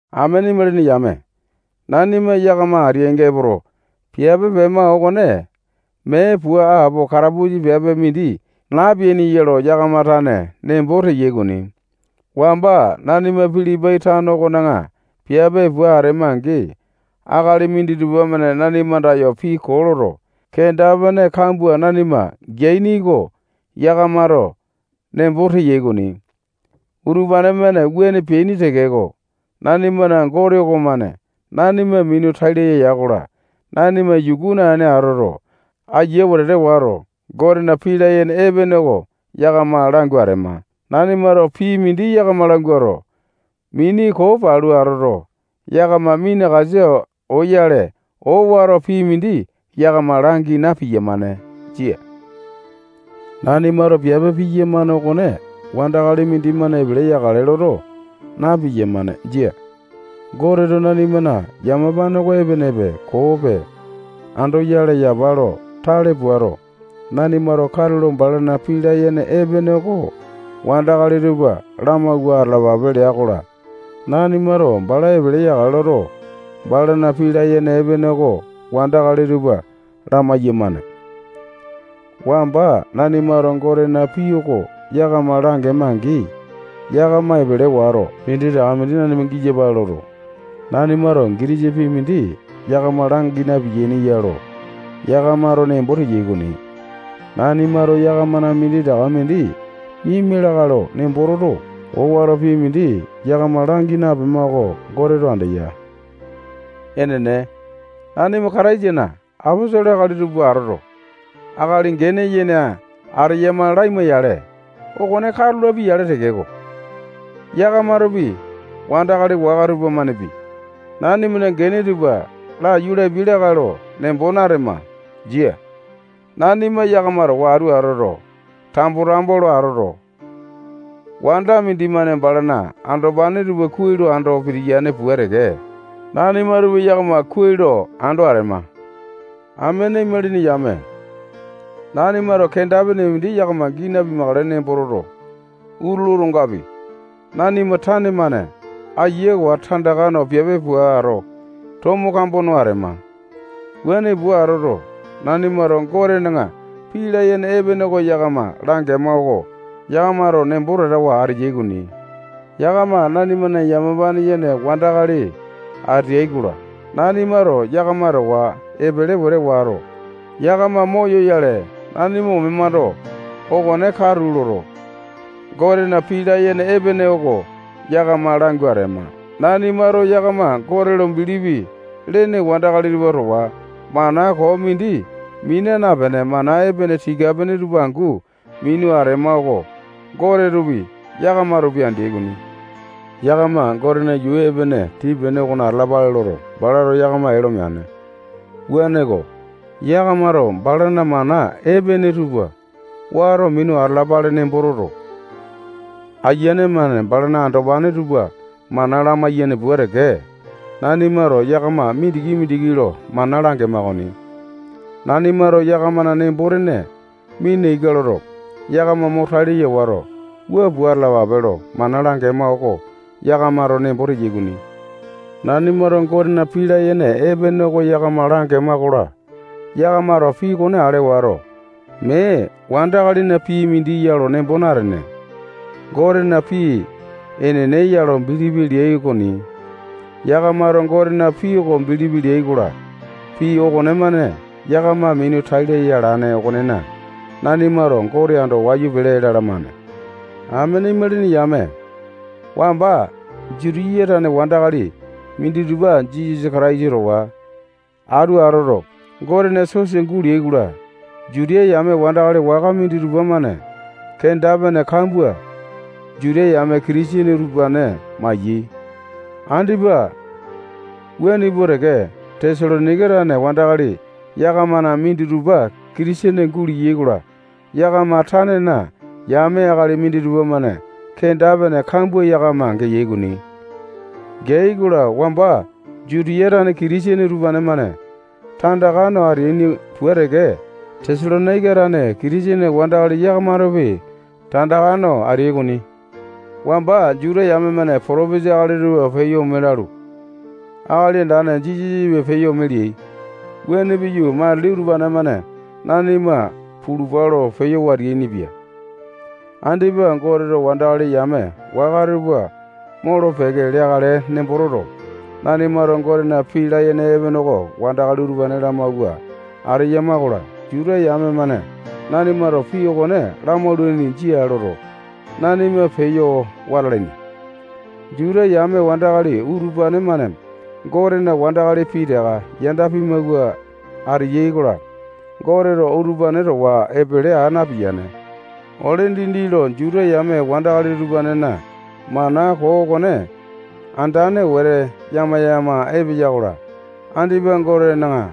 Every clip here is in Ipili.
Amene imalini yame, nanima yakama ateainga epoto, piape pema okone mee pua apo katapusa piape mindi napeaini ya lo yakama tane nembo teyai okoni. Wamba nanima Pilipai tano okona piape pua atema-angi, akali minditupa-mane nanima andayo pii koo loto, kenda-pene kambua nanima geaini oko yakamato nembo teyai okoni. Utupane-mane wuane peaini tekeko, nanimana Gote okomane nanima minu tai laya ya-kola, nanima yuku naene atoto, aiya wete wato, Gotena pii layene epene oko yakama langu atema. Nanimato pii mindi yakama languato, mini koo palu atoto, yakama minakasa oyale, owato pii mindi yakama langi na-piyamane. Jia. Nanimato piape piyamane okone wandakali mindimane epele yakale loto, na-piyamane. Jia. Goteto nanimana yamapane oko epenepe, koope andoyale yapa lo tale puato, nanimato katulo balana pii layene epene oko wandakali tupa lamawua atalapape lea-kola, nanimato bala epele yakale loto, balana pii layene epene oko wandakali tupa lamai-yamane. Wamba nanimato Gotena pii oko yakama langema-angi, yakama epele wato, minditaka mindi nanima giyapale loto, nanimato gitisa pii mindi yakama langi napeaini ya lo yakamato nembo teyai okoni. Nanimato yakamana minditaka mindi miama lakae lo nembo toto, owato pii mindi yakama langi napema oko Goteto andeya. Enene, nanima Kataisana aposolo akali tupa atoto, akali gene yene ateyama laima-yale, okone katu lapia-yale tekeko, yakamatopi, wandakali waka tupamanepi, nanimana gene tupa laiyu lapia lakae lo nembo natema. Jia. Nanima yakama towa atu atoto, tambo-tambo lo atoto, wanda mindimane balana andopane tupa kuai lo ando pitiyane pua teke, nanimatopi yakama kuai lo ando atema. Amene imalini yame, nanimato kenda-pene mindi yakama gii napimakale nembo toto, utulu otongapi, nanima tane-mane ayawa tandaka no piape puato, tomo kambo no atema. Wuane pua atoto, nanimato Gotena pii layene epene oko yakama langema oko yakamato nembo tatawa ateyai okoni. Yakama nanimana yamapane yene wandakali ateai-kola, nanimato yakama towa epele wete wato, yakama moyoyale nanima omemando, okone katu loto, Gotena pii layene epene oko yakama langu atema. Nanimato yakama Gote lo bilipi lene wandakali tupa towa mana koo mindi mina napene, mana epene tika-pene tupa angu minu atema oko Gotetopi, yakamatopi, andeai okoni. Yakama Gotena yuu epene tii-pene okona atalapale loto, balato yakama ee lo meane. Wuaneko, yakamato balana mana epene tupa wato minu atalapale nembo toto, ayiane-mane balana andopane tupa mana lamaiyane pua teke, nanimato yakama mindiki-mindiki lo mana langema okoni. Nanimato yakamana nembo-tene mina ika loto, yakama mo tai laya wato, wua pua atalapape lo mana langema oko yakamato nembo teyai okoni. Nanimato Gotena pii layene epene oko yakama langema-kola, yakamato pii okone ale wato, mee wandakalina pii mindi ya lo nembo natene, Gotena pii enene ya lo bilipi leai okoni. Yakamato Gotena pii oko bilipi leyai-kola, pii okonemane yakama minu tai laya alane okonena, nanimato Gote ando wayu pele lalamane. Amene imalini yame, wamba Jutiya tane wandakali minditupa Jisasa Kataisa towa atu atoto, Gotena sosa guleai-kola, Juta yame wandakali waka minditupa-mane kenda-pene kambua Juta yame Kitisene utupane maiyai. Andipa wuane pua teke, Tesalonaika tane wandakali yakamana minditupa Kitisene guleai-kola, yakama tanena yame akali minditupa-mane kenda-pene kambua yakama geai okoni. Geai-kola, wamba Jutiya tane Kitisene utupane-mane tandaka no ateaini pua teke, Tesalonaika tane Kitisene wandakali yakamatopi tandaka no ateai okoni. Wamba Juta yame-mane potopesa akali tupa peyo ome lalu, Akali Andane Jisasapi peyo ome leai. Wuane piyu, matili utupane-mane nanima pulupa lo peyo wateainipia. Andipa Goteto wandakali yame waka tupa molo-peke leakale nembo toto, nanimato Gotena pii layene epene oko wandakali utupane lamawua ateyama-kola, Juta yame-mane nanimato pii okone lamaulaini, jia loto, nanima peyo wata alaini. Juta yame wandakali utupane-mane Gotena wandakali pitaka yanda pimawua ateyai-kola, Goteto utupane towa epele aa napiyane. Ole dindi lo Juta yame wandakali utupanena mana koo okone andane wete yama-yama epeya-kola, andipa Gotena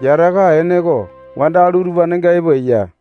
yataka ene oko wandakali utupanenga epo eya.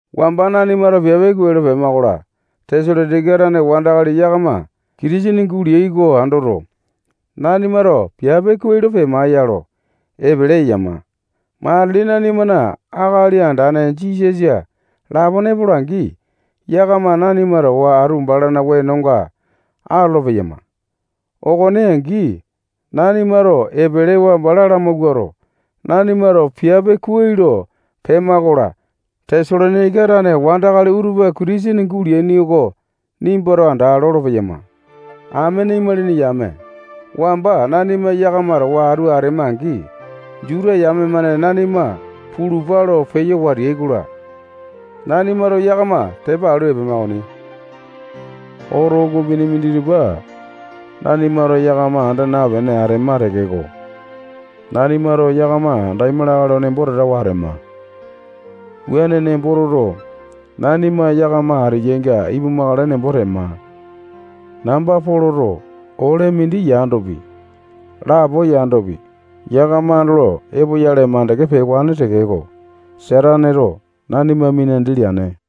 Wamba nanimato piape kuai lo pema-kola, Tesalonaika tane wandakali yakama Kitisene guleai oko andoto, nanimato piape kuai lo pema ya lo, epele eyama. Matili nanimana Akali Andane Jisasa lapone epola-angi, yakama nanima towa atu balana wenonga atolo-peyama. Okone angi, nanimato epelewa bala lamawuato, nanimato piape kuai lo pema-kola, Tesalonaika tane wandakali utupa Kitisene guleaini oko nimbato anda, lolo-peyama. Amene imalini yame, wamba nanima yakama towa atu atema-angi, Juta yame-mane nanima pulupa lo peyo wateai-kola, nanimato yakama tepa alu epema okoni. Oto ukupini minditupa nanimato yakama anda napene atema tekeko, nanimato yakama andaima lakae lo nembo tatawa atema. Wuane nembo toto, nanima yakama ateyainga ipumakale nembo tema. Namba Poloto ole mindi yandopi, lapo yandopi, yakama andolo epoyale makande pewane tekeko, Sataneto nanima minandi leane.